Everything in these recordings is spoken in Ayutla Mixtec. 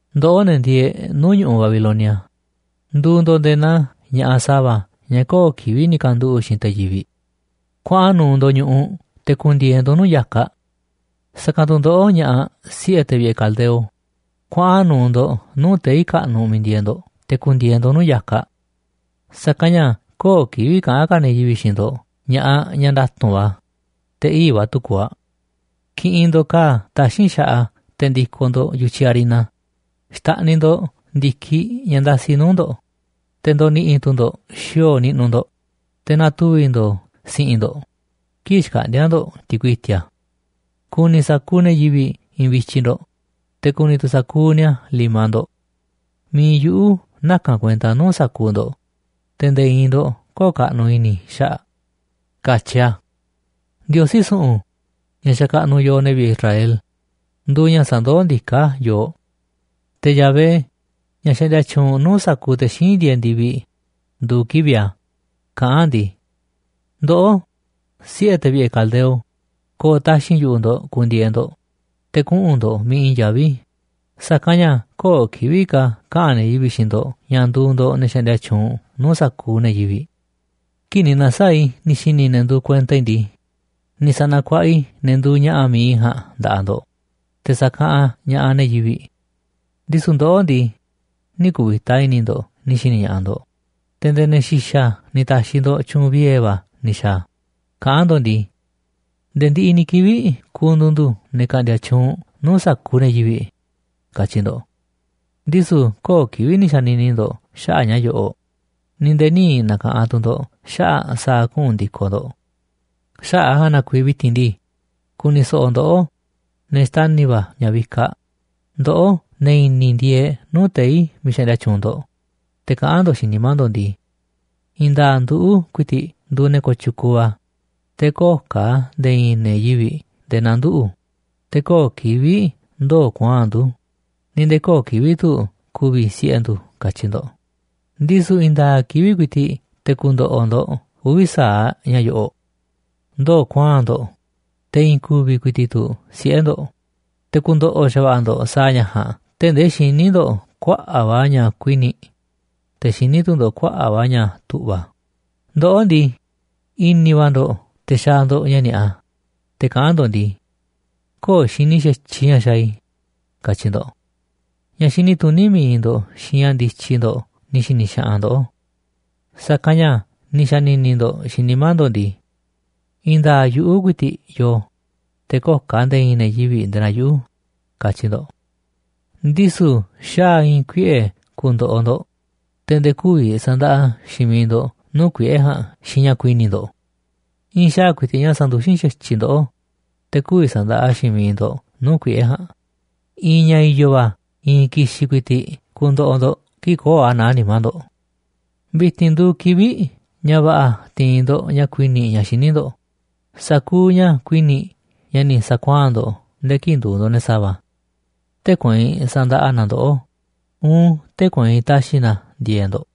’Ndoꞌó, ne̱ ndieeꞌ nuu̱ꞌ ñu̱ꞌuꞌ Babilonia, nduuꞌ ndo̱ꞌ nde̱e̱ naa ña̱ꞌaꞌ sa̱va̱ ñaꞌ köo̱ꞌ kivi̱ꞌ ni̱ kanduꞌu̱ꞌ xiinꞌ te̱ yivi̱ꞌ. Kuaꞌan nu̱u̱ ndo̱ꞌ ñu̱ꞌuꞌ te̱ ku̱ndi̱e̱e̱ ndo̱ꞌ nuu̱ꞌ ya̱kaꞌ. Sa̱kanꞌ tu̱ ndoꞌó, ña̱ꞌaꞌ siꞌe̱ te̱ vi̱ꞌe̱ caldeo, kuaꞌan nu̱u̱ ndo̱ꞌ nuu̱ꞌ tei̱ kaꞌnuꞌ miiꞌ ndieeꞌ ndo̱ꞌ te̱ ku̱ndi̱e̱e̱ ndo̱ꞌ nuu̱ꞌ ya̱kaꞌ. Sa̱kanꞌ ña̱ köo̱ꞌ kivi̱ꞌ ka̱ kaꞌa̱n ne̱ yivi̱ꞌ xiinꞌ ndo̱ꞌ ña̱ꞌaꞌ ñaꞌ nda̱tu̱nꞌ va̱, te̱ ii̱ꞌ va̱ tu̱ kuuꞌ aꞌ. Ki̱ꞌi̱n ndo̱ꞌ ka̱a̱ taxín xaꞌa te̱ ndi̱ko̱ ndo̱ꞌ yu̱tyiꞌ harina. Xta̱ꞌniꞌ ndo̱ꞌ ndi̱kiꞌ ña̱ ndasi nuu̱ꞌ ndo̱ꞌ, te̱ ndo̱ni̱ꞌi̱ tu̱ ndo̱ꞌ xi̱o̱o̱ niꞌnuꞌ ndo̱ꞌ, te̱ na̱tuvi̱ ndo̱o̱ si̱ꞌi̱n ndo̱ꞌ, kii̱ꞌ xkaꞌndi̱a̱ ndo̱ꞌ ti̱kui i̱ti̱a̱. Ku̱ni̱ sa̱kuuꞌ ne̱ yivi̱ꞌ i̱i̱nꞌ vityiꞌ ndo̱ꞌ, te̱ ku̱ni̱ tu̱ sa̱kuuꞌ ni̱a̱ limaꞌ ndo̱ꞌ. Mi̱iꞌ yuꞌu̱ naka̱n kuenta nuu̱ꞌ sa̱kuuꞌ ndo̱ꞌ, te̱ nde̱e̱ i̱i̱n ndo̱ꞌ kö̱o̱ꞌ kaꞌnuꞌ i̱ni̱ i̱ xaꞌa̱ꞌ”, katyi a̱. Ndiosí su̱ꞌu̱n, ña̱ xakaꞌnuꞌ yooꞌ, ne̱ vi̱ꞌe̱ Israel, nduuꞌ ña̱ sandoó ndiká yooꞌ. Te̱ Yahvé, ña̱ xaꞌndia tyuunꞌ nuu̱ꞌ sa̱kuuꞌ te̱ xíinꞌ ndieeꞌ ndi̱viꞌ, nduuꞌ kivi̱ꞌ a̱. Kaꞌán a̱ ndii: “Ndoꞌó, siꞌe̱ te̱ vi̱ꞌe̱ caldeo, ko̱o̱ taxi̱nꞌ yu̱ꞌuꞌ ndo̱ꞌ ku̱ndi̱e̱e̱ ndo̱ꞌ, te̱ kuꞌu̱n ndo̱ꞌ miiꞌ i̱i̱n yaví, sa̱kanꞌ ña̱ köo̱ꞌ kivi̱ꞌ ka̱ kaꞌa̱n ne̱ yivi̱ꞌ xiinꞌ ndo̱ꞌ ña̱ nduuꞌ ndo̱ꞌ ne̱ xaꞌndia tyuunꞌ nuu̱ꞌ sa̱kuuꞌ ne̱ yivi̱ꞌ. Kii̱ꞌ ni̱ na̱saa̱ꞌ i̱ ni̱ xi̱ni̱ i̱ ne̱ nduuꞌ kuenta i̱ ndii, ni̱ sa̱na̱kuaꞌa i̱ ne̱ nduuꞌ ña̱ꞌa̱ mi̱iꞌ i̱ ja̱a̱nꞌ nda̱ꞌaꞌ ndo̱ꞌ, te̱ sa̱kaꞌanꞌ ña̱ꞌaꞌ ne̱ yivi̱ꞌ. Ndisu̱ ndoꞌó ndii, nï̱ ku̱vi̱ta i̱ni̱ ndo̱ꞌ ni̱ xi̱ni̱ ña̱ꞌaꞌ ndo̱ꞌ, te̱ nde̱e̱ ne̱ xi̱xa̱ ni̱ ta̱xi̱ ndo̱ꞌ tyu̱u̱n viee̱ va̱ ni̱ xa̱a̱, kaꞌán ndo̱ꞌ ndii: Nde̱e̱ ndiꞌiꞌ ni̱ kivi̱ꞌ ku̱ndu̱u̱ ndu̱ ne̱ ka̱ꞌndi̱a̱ tyuunꞌ nuu̱ꞌ sa̱kuuꞌ ne̱ yivi̱ꞌ, katyi̱ ndo̱ꞌ. Ndisu̱ köo̱ꞌ kivi̱ꞌ ni̱ xa̱ni̱ni̱ ndo̱ꞌ xaꞌa̱ꞌ ña̱ yo̱ꞌo̱ꞌ, ni̱ nde̱e̱ nï̱ na̱ka̱ꞌanꞌ tu̱ ndo̱ꞌ xaꞌa̱ꞌ sa̱a̱ kuꞌu̱n ndi̱koꞌ ndo̱ꞌ. ’Xaꞌa̱ꞌ a̱ ja̱a̱nꞌ na kuiiꞌ vi̱ti̱n ndii, ku̱ni̱ so̱ꞌo̱ ndoꞌó, ne̱ xtani̱ va̱ ña̱ vikaꞌ, ndoꞌó, ne̱ i̱ni̱ ndieeꞌ nuu̱ꞌ tei̱ miiꞌ xaꞌndia tyuunꞌ ndo̱ꞌ. Te̱ kaꞌán ndo̱ꞌ xiinꞌ nimá ndo̱ꞌ ndii: I̱i̱n nda̱a̱ꞌ nduꞌu̱ ku̱i̱ti̱ꞌ nduuꞌ ne̱ kooꞌ tyukuuꞌ va̱, te̱ köo̱ꞌ ka̱ nde̱e̱ i̱i̱n ne̱ yivi̱ꞌ nde̱e̱ naa nduꞌu̱, te̱ köo̱ꞌ kivi̱ꞌ ndoo̱ kuaa̱nꞌ ndu̱, ni̱ nde̱e̱ köo̱ꞌ kivi̱ꞌ tu̱ ku̱vi̱ siꞌe̱ ndu̱, katyi ndo̱ꞌ. Ndisu̱ i̱i̱n nda̱a̱ꞌ kivi̱ꞌ ku̱i̱ti̱ꞌ te̱ ku̱ndo̱ꞌo̱ ndo̱ꞌ uvi̱ sa̱aꞌ ña̱ yo̱ꞌo̱ꞌ: ndoo̱ kuaa̱nꞌ ndo̱ꞌ, te̱ i̱i̱n ku̱vi̱ ku̱i̱ti̱ꞌ tu̱ siꞌe̱ ndo̱ꞌ, te̱ ku̱ndo̱ꞌo̱ xa̱va̱ꞌa̱ ndo̱ꞌ sa̱a̱ ña̱ ja̱a̱nꞌ tee̱ꞌ ndee xiní ndo̱ꞌ kuaꞌa̱ꞌ va̱ ña̱ kuini̱ꞌ, te̱ xiní tu̱ ndo̱ꞌ kuaꞌa̱ꞌ va̱ ña̱ tu̱ꞌva̱. Ndoꞌó ndii, i̱ni̱ va̱ ndo̱ꞌ te̱ xaaꞌ ndo̱ꞌ ña̱ ni̱a̱ꞌa, te̱ kaꞌán ndo̱ꞌ ndii: Köo̱ꞌ xini xa̱tyiꞌ ña̱ xaaꞌ i̱, katyi ndo̱ꞌ. Ña̱ xini tuní mi̱iꞌ ndo̱ꞌ xiinꞌ ña̱ ndityi ndo̱ꞌ ni̱ xi̱ni̱ xaꞌanꞌ ndoꞌó. Sa̱kanꞌ ña̱ ni̱ xa̱ni̱ni̱ ndo̱ꞌ xiinꞌ nimá ndo̱ꞌ ndii: I̱i̱n nda̱a̱ꞌ yuꞌu̱ ku̱i̱ti̱ꞌ yoo, te̱ köo̱ꞌ ka̱ nde̱e̱ i̱i̱n ne̱ yivi̱ꞌ nde̱e̱ naa yuꞌu̱, katyi ndo̱ꞌ. Ndisu̱ xaa̱ i̱i̱n kuiꞌe̱ ku̱ndo̱ꞌo̱ ndo̱ꞌ, te̱ nde̱e̱ kü̱vi̱ sa̱ndaꞌa xiinꞌ miiꞌ ndo̱ꞌ nuu̱ꞌ kuiꞌe̱ ja̱a̱nꞌ xiinꞌ ña̱ kuini̱ꞌ ndo̱ꞌ. I̱i̱n xaa̱ ku̱i̱ti̱ꞌ ña̱ sanduxín xatyiꞌ ndoꞌó, te̱ kü̱vi̱ sa̱ndaꞌa xiinꞌ miiꞌ ndo̱ꞌ nuu̱ꞌ kuiꞌe̱ ja̱a̱nꞌ. I̱i̱n ña̱ i̱yo̱ va̱ i̱i̱n ki̱xi̱n ku̱i̱ti̱ꞌ ku̱ndo̱ꞌo̱ ndo̱ꞌ kii̱ꞌ köo̱ꞌ a̱ naá nimá ndo̱ꞌ. ’Vi̱ti̱n nduuꞌ kivi̱ꞌ ña̱ va̱ꞌa̱ ti̱i̱n ndo̱ꞌ ña̱ kuini̱ꞌ ña̱ xiní ndo̱ꞌ, sa̱kuuꞌ ña̱ kuini̱ꞌ ña̱ ni̱ sa̱kuaa̱n ndo̱ꞌ nde̱e̱ kii̱ꞌ nduuꞌ ndo̱ꞌ ne̱ sa̱va̱. Tee̱ꞌ kueinꞌ sa̱ndaꞌa na a̱ ndoꞌó uun tee̱ꞌ kueinꞌ ta̱xi̱ na a̱ ndi̱e̱e̱ꞌ ndo̱ꞌ.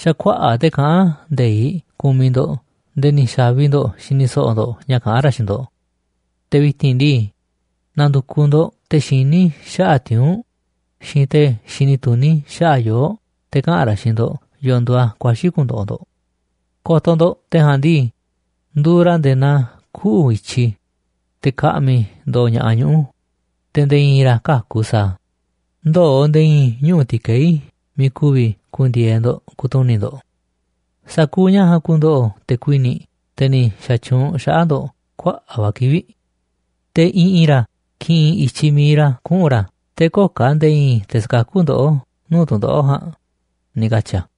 Xa̱ kuaꞌa̱ꞌ te̱ kaꞌán nde̱iꞌ kumiꞌ ndo̱ꞌ nde̱e̱ ni̱ xa̱vi ndo̱ꞌ xini so̱ꞌo̱ ndo̱ꞌ ña̱ kaꞌán ra̱ xiinꞌ ndo̱ꞌ. Te̱ vi̱ti̱n ndii, na̱ndu̱kuꞌ ndo̱ꞌ te̱ xiní xaꞌa̱ꞌ tiuu̱nꞌ xiinꞌ te̱ xini tuní xaꞌa̱ꞌ yoo̱ꞌ, te̱ kaꞌa̱n ra̱ xiinꞌ ndo̱ꞌ yo̱o̱ nduuꞌ a̱ kuaxi̱ ku̱ndo̱ꞌo̱ ndo̱ꞌ. Ko̱to̱ ndo̱ꞌ. Te̱ ja̱a̱nꞌ ndii, nduuꞌ ra̱ nde̱e̱ naa kuꞌu̱ i̱tyiꞌ, te̱ ka̱ꞌmi̱ ndo̱o̱ ña̱ꞌaꞌ ñuꞌu̱, te̱ nde̱e̱ i̱i̱n ra̱ käku̱ sa̱a̱ a̱, ndöo̱ nde̱e̱ i̱i̱n ñuꞌu̱ ti̱kei̱ miiꞌ ku̱vi̱ ku̱ndi̱e̱e̱ ndo̱ꞌ ku̱tuni̱ꞌ ndo̱ꞌ. Sa̱kuuꞌ ña̱ ja̱a̱nꞌ ku̱ndo̱ꞌo̱ te̱ kuini̱ꞌ, te̱ ni̱ xa̱tyuunꞌ xaꞌa̱ꞌ ndo̱ꞌ kuaꞌa̱ꞌ va̱ kivi̱ꞌ. Te̱ i̱ꞌi̱n ra̱ ki̱ꞌi̱n i̱tyiꞌ mi̱iꞌ ra̱ kuꞌu̱n ra̱ te̱ köo̱ꞌ ka̱ nde̱e̱ i̱i̱n te̱ sa̱kakú ndoꞌó nuu̱ꞌ tu̱ndoꞌo̱ꞌ ja̱a̱nꞌ”, ni̱ katyi̱ a̱.